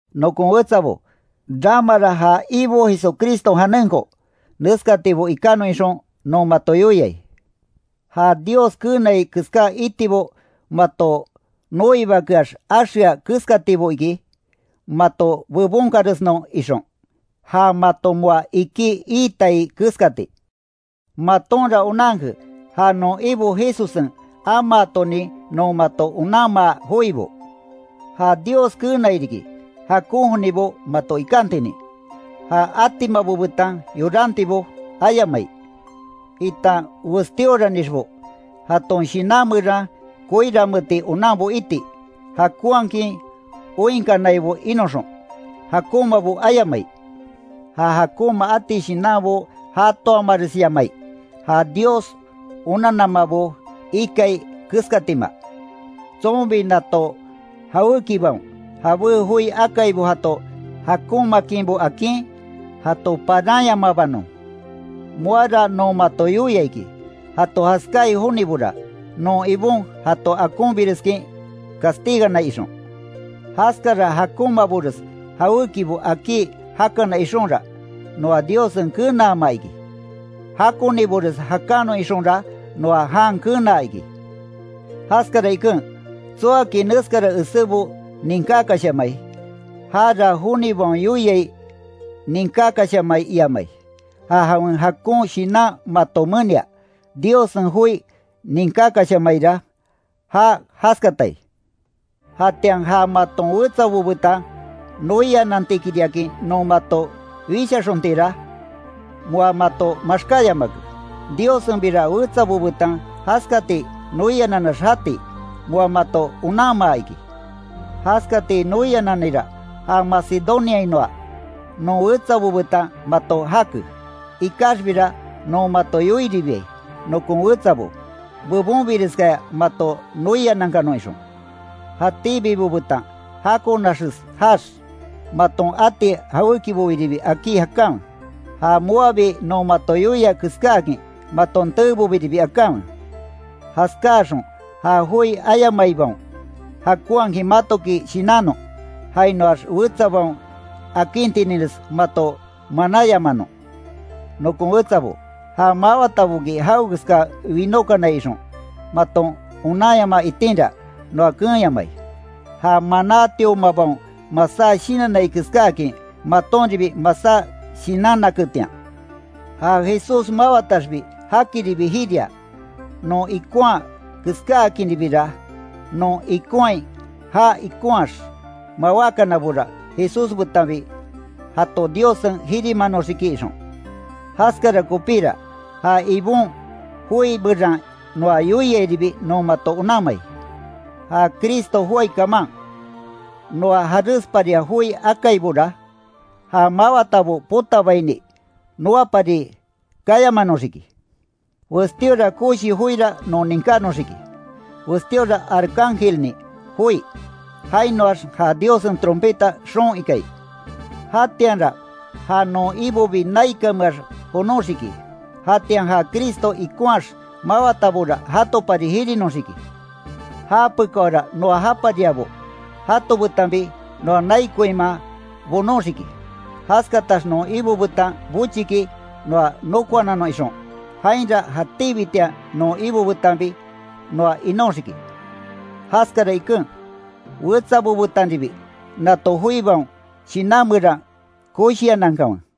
Nokon wetsabo, ramara ja Ibo Jesucriston janenko neskatibo ikanon ixon, non mato yoiai; ja Dios keenai keská itibo mato noibakeax axea keskatibo iki, mato bebonkanresnon ixon, ja mato moa iki iitai keskati. Matonra onanke ja non Ibo Jesussen amaatonin non mato onanmaa joibo. Ja Dios keenai riki, jakon jonibo mato ikantinin, ja atimabo betan yorantibo ayamai, itan westíoranixbo, jaton shinan meran koiranmeeti onanbo iti, jakonhakin oinkanaibo inoxon, jakonmabo ayamai, ja jakonma ati shinanbo jatoamaresyamai, ja Dios onannamabo ikai keskatima. Tsonbi nato jawékibaon, jabé joi akaibo jato jakonmaakinbo akin, jato paranyamabanon. Moara non mato yoia iki, jato jaskáai jonibora, non Ibon jato akonbireskin castiganai ixon. Jaskara jakonmabores jawékibo akí jakanon ixonra, noa Diossen kenaama iki, jakonibores jakanon ixonra noa jan kenaa iki. Jaskara iken, tsoaki neskara esébo ninkákashamai, jara jonibaon yoiai ninkakashamai iamai, ja jawen jakon Shinan mato menia, Diossen joi ninkákashamaira ja jaskatai. Jatian ja maton wetsabo betan noianantikiriakin non mato wishaxontira, moa mato maxkáyamake. Diossenbira wetsabo betan jaskati noianannax jati, moa mato onanmaa iki. Jaskati noiananira, ja Macedoniainoa non wetsabo betan mato jake. Ikaxbira, non mato yoiribiai, nokon wetsabo, bebonbireskaya mato noianankanon ixon. Jatíbibo betan jakonaxes jaax, maton ati jawékiboribi akí jakanwe, ja moabi non mato yoia keskáakin maton teebobiribi akanwe. Jaskáaxon ja joi ayamaibaon, jakonhakin matoki shinannon, jainoax wetsabaon akintininres mato manáyamanon. Nokon wetsabo, ja mawataboki jawekeska winókanai ixon, maton onanyamaa itinra, noa keenyamai. Ja manátiomabaon masá shinannai keskáakin, matonribi masá shinannaketian. Ja Jesús mawataxbi jakiribi jiria, non ikonhaa keskáakinribira, non ikonhai já ikonhaax mawákanabora, Jesús betanbi jato Diossen jirimanoxiki ixon. Jaskara kopíra, ja Ibon joi meran noa yoiairibi, non mato onanmai. Ja Cristo joái kaman, noa jaresparia joi akaibora, ja mawatabo potabaini, noapari kayamanoxiki. Westíora koshi joira non ninkánoxiki, westíora arcángelnin joi, jainoax ja Diossen trompeta xoon ikai. Jatianra ja non Ibobi naikanmeax jonoxiki, jatian ja Cristo ikonhaax mawatabora jatopari jirinoxiki. Japekáora noa japariabo, jato betanbi, noa nai koinman bonóxiki, jaskatax non Ibo betan bochiki noa nokoananon ixon, jainra jatíbitian non Ibo betanbi noa inóxiki. Jaskara iken, wetsabo betanribi nato joibaon, shinan meran koshianankanwe.